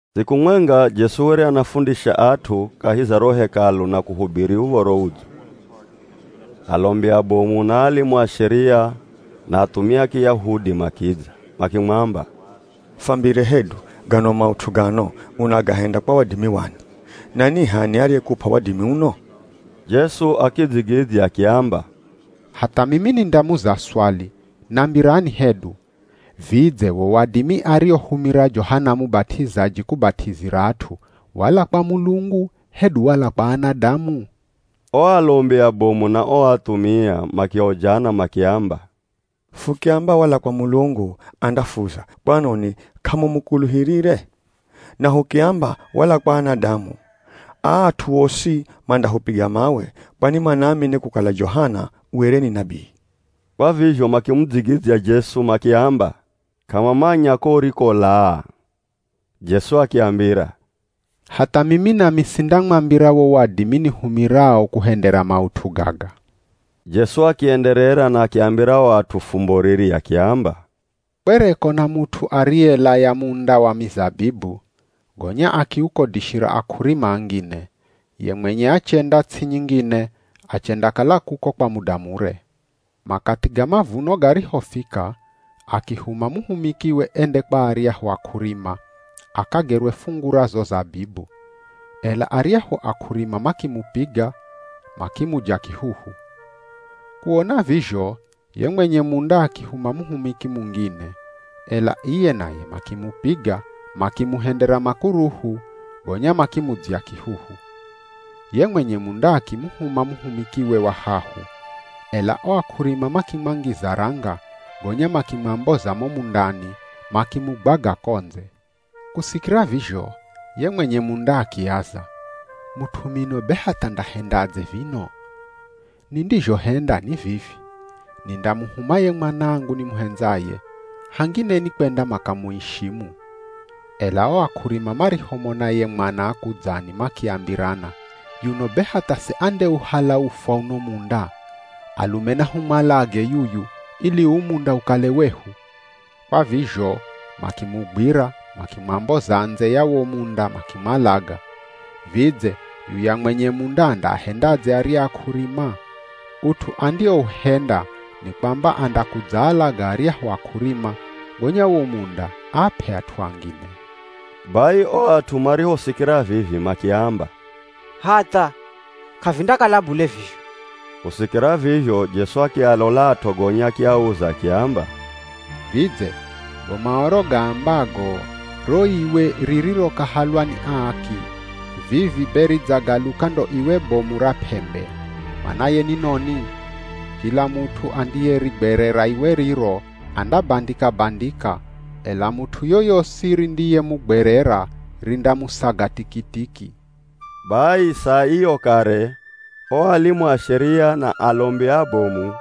Siku mwenga Jesu were anafundisha at'u kahi za ro Hekalu na kuhubiri Uv̱oro Udzo. Alombi abomu, na alimu a Sheria, na athumia a Kiyahudi makidza. Makimwamba, “Fambire hedu, gano maut'u gano unagahenda kwa wadimi wani? Na ni h'ani ariyekup'a wadimi uno?” Jesu akidzigidzya akiamba, “Hatha mimi nindamuza swali, nambirani hedu, Vidze wo wadimi ariohumira Johana Mubat'izaji kubat'izira at'u, wala kwa Mulungu hedu wala kwa anadamu?” O alombi abomu na o athumia makiojana makiamba, “Fukiamba wala kwa Mulungu, andafuza, ‘Kwanoni k'amumukuluhirire?’ Na hukiamba, ‘Wala kwa anadamu,’ aa at'u osi mandahupiga mawe kwani manaamini kukala Johana were ni nabii.” Kwa vizho makimudzigidzya Jesu makiamba k'amamanya ko urikolaa. Jesu akiambira, “Hatha mimi nami sindamwambira wo wadimi nihumirao kuhendera maut'u gaga.” Jesu akienderera na akiambira o at'u fumbo riri, akiamba, “Kwereko na mut'u ariyelaya munda wa mizabibu, gonya akiukodishira ak'urima angine, ye mwenye achenda ts'i nyingine achendakala kuko kwa muda mure. Makathi ga mavuno garihofika, akihuma muhumikiwe ende kwa aryahu ak'urima, akagerwe fungu ra zo zabibu. Ela aryahu ak'urima makimupiga, makimuja kihuhu. Kuona vizho ye mwenye munda akihuma muhumiki mungine, ela iye naye makimupiga, makimuhendera makuruhu, gonya makimudzya kihuhu. Ye mwenye munda akimuhuma muhumikiwe wa hahu, ela o ak'urima makimwangiza ranga gonya makimwamboza mo mundani, makimugwaga ko ndze. Kusikira vizho ye mwenye munda akiaza, ‘Mut'u mino be hatha ndahendadze vino? Nindizhohenda ni vivi, nindamuhuma ye mwanangu nimuhendzaye, hangine nikwenda makamuishimu.’ Ela o ak'urima marihomona ye mwana akudzani makiambirana, ‘Yuno be hatha se andiyeuhala ufwa uno munda? Alume nahumwalage yuyu, ili uu munda ukale wehu.’ Kwa vizho makimugwira makimwamboza ndze ya wo munda makimwalaga. Vidze yuya mwenye munda andaahendadze arya ak'urima? Ut'u andiouhenda ni kwamba andakudzaalaga aryahu ak'urima, gonya wo munda aap'e at'u angine.” Bai o at'u marihosikira vivi makiamba, “Hatha! K'avindakala bule vizho.” Kusikira vizho Jesu akialolat'o gonya akiauza akiamba, “Vidze go Maoro gaambago, ‘Ro iwe ririrokahalwa ni aaki vivi be ridzagaluka ndo iwe bomu ra p'embe,’ manaye ni noni? Kila mut'u andiyerigwerera iwe riro, andabandika-bandika, ela mut'u yoyosi rindiyemugwerera rindamusaga tikitiki.” Bai saa iyo kare o alimu a Sheria, na alombi abomu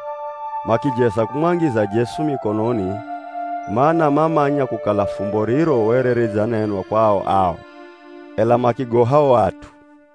makijeza kumwangiza Jesu mikononi, mana mamanya kukala fumbo riro were ridzanenwa kwao ao, ela makigoha o at'u.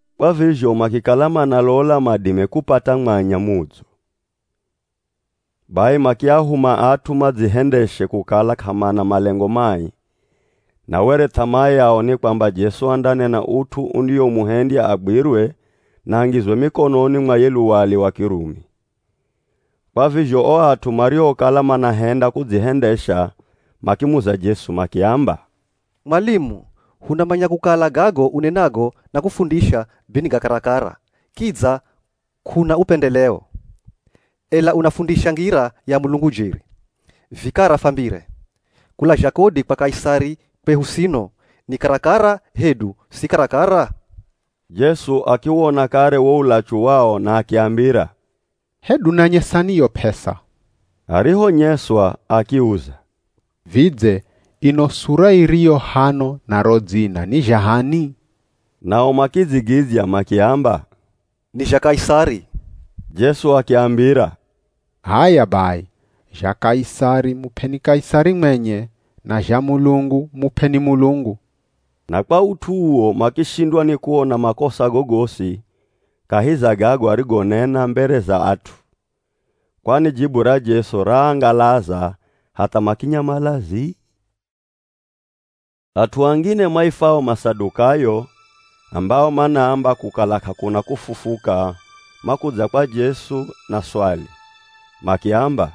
Kwa vizho makikala manalola madime kupata mwanya mudzo. Bai makiahuma at'u madzihendeshe kukala k'amana malengo mai, na were th'amaa yao ni kwamba Jesu andanena ut'u undiomuhendya agwirwe na angizwe mikononi mwa ye luwali wa Kirumi. Kwa vizho o at'u mariokala manahenda kudzihendesha makimuza Jesu makiamba, “Mwalimu, hunamanya kukala gago unenago na kufundisha be ni ga karakara, kidza k'una upendheleo, ela unafundisha ngira ya Mulungu jeri. Vikara fwambire. Kulazha kodi kwa Kaisari kwehu sino, ni karakara hedu si karakara?” Jesu akiwona kare wo ulachu wao na akiambira, “Hedu nanyesani yo p'esa.” Arihonyeswa akiuza, “Vidze ino sura iriyo hano na ro dzina ni zha h'ani?” Nao makidzigidzya makiamba, “Ni zha Kaisari.” Jesu akiambira, “H'aya bai, zha Kaisari, mup'eni Kaisari mwenye, na zha Mulungu, mup'eni Mulungu.” Na kwa ut'u uwo makishindwa ni kuona makosa gogosi kahi za gago arigonena mbere za at'u, kwani jibu ra Jesu raangalaza hatha makinyamala zii. At'u angine maifwao Masadukayo ambao manaamba kukala k'akuna kufufuka makudza kwa Jesu na swali, makiamba,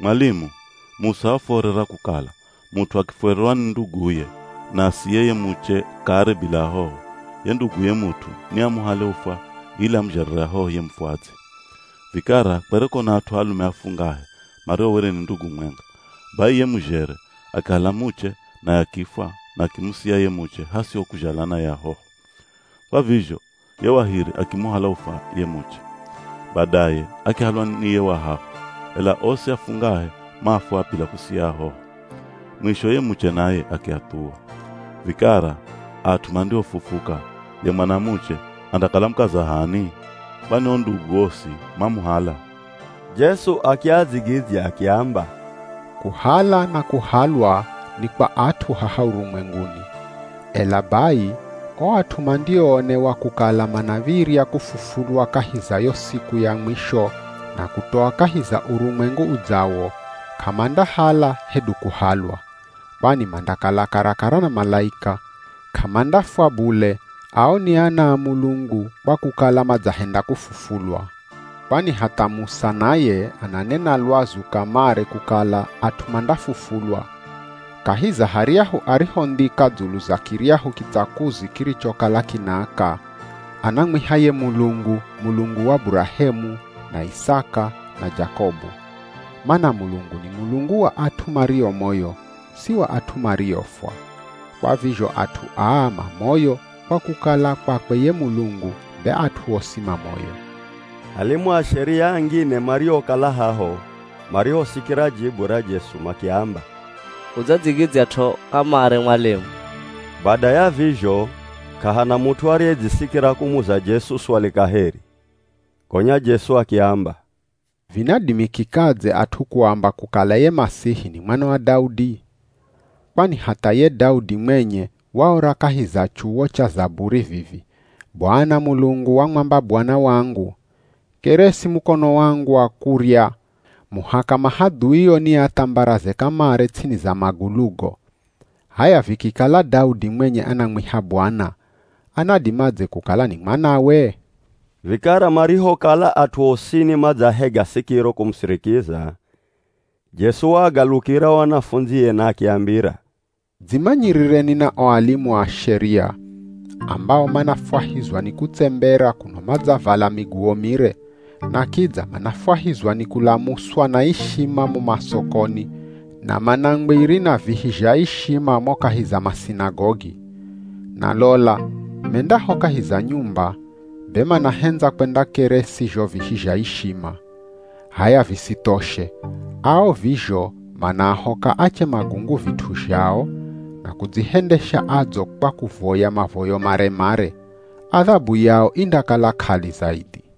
“Mwalimu, Musa wafuorera kukala, mut'u akifwererwa ni nduguye, na asiye ye muche kare bila ahoho, ye nduguye mut'u ni amuhale ufwa ili amuzhalire ahoho ye mufwadzi. Vikara kwereko na at'u alume afungahe mario were ni ndugu mwenga, bai ye muzhere akihala muche naye akifwa na akimusia ye muche hasiho kuzhala naye ahoho. Kwa vizho ye wa hiri akimuhala ufwa ye muche. Badaye akihalwa ni ye wa hahu, ela osi afungahe mafwa bila kusiya ahoho. Mwisho ye muche naye akiathuwa. Vikara at'u mandihofufuka, ye mwanamuche andakala mukaza h'ani? Kwani o ndugu osi mamuhala.” Jesu akiadzigidzya akiamba, “Kuhala na kuhalwa ni kwa at'u haha urumwenguni. Ela bai o at'u mandioonewa kukala manav̱irya kufufulwa kahi za yo siku ya mwisho na kutoa kahi za urumwengu udzawo, k'amandahala hedu kuhalwa. Kwani mandakala karakara na malaika, k'amandafwa bule ao ni ana a Mulungu kwa kukala madzahenda kufufulwa. Kwani hatha Musa naye ananena lwazu kamare kukala at'u mandafufulwa, kahi za haryahu arihondhika dzulu za kiryahu kitsakuzi kirichokala kinaaka, anamwiha ye Mulungu, Mulungu wa Burahemu, na Isaka, na Jakobu. Mana Mulungu ni Mulungu wa at'u mario moyo, si wa at'u mariofwa. Kwa vizho at'u aa ma moyo kwa kukala kwakwe ye Mulungu be at'u osi ma moyo.” Alimu a Sheria angine mariokala haho marihosikira jibu ra Jesu makiamba, “Udzadzigidzyat'o kamare mwalimu.” Bada ya vizho k'ahana mut'u ariyedzisikira kumuza Jesu swali kaheri. Gonya Jesu akiamba, “Vinadimikikadze at'u kuamba kukala ye Masihi ni Mwana wa Daudi? Kwani hatha ye Daudi mwenye waora kahi za chuwo cha Zaburi vivi, ‘Bwana Mulungu wamwamba Bwana wangu, “Keresi mukono wangu wa kurya muhaka mahadhuio niathambaraze kamare ts'ini za magulugo.” ’ H'aya vikikala Daudi mwenye anamwiha ‘Bwana,’ anadimadze kukala ni mwanawe?” Vikara marihokala at'u osini madzahega sikiro kumusirikiza, Jesu waagalukira o anafundzie na akiambira, “Dzimanyirireni na o alimu a Sheria ambao manafwahizwa ni kutsembera kuno madzavala miguwo mire, na kidza manafwahizwa ni kulamuswa na ishima mo masokoni na mana ngwiri na vihi zha ishima mo kahi za masinagogi. Na lola mendaho kahi za nyumba, be manahendza kwendakeresi zho vihi zha ishima. H'aya visithoshe, ao vizho manaahoka ache magungu vit'u zhao, na kudzihendesha adzo kwa kuvoya mavoyo mare-mare. Adhabu yao indakala k'ali zaidhi.”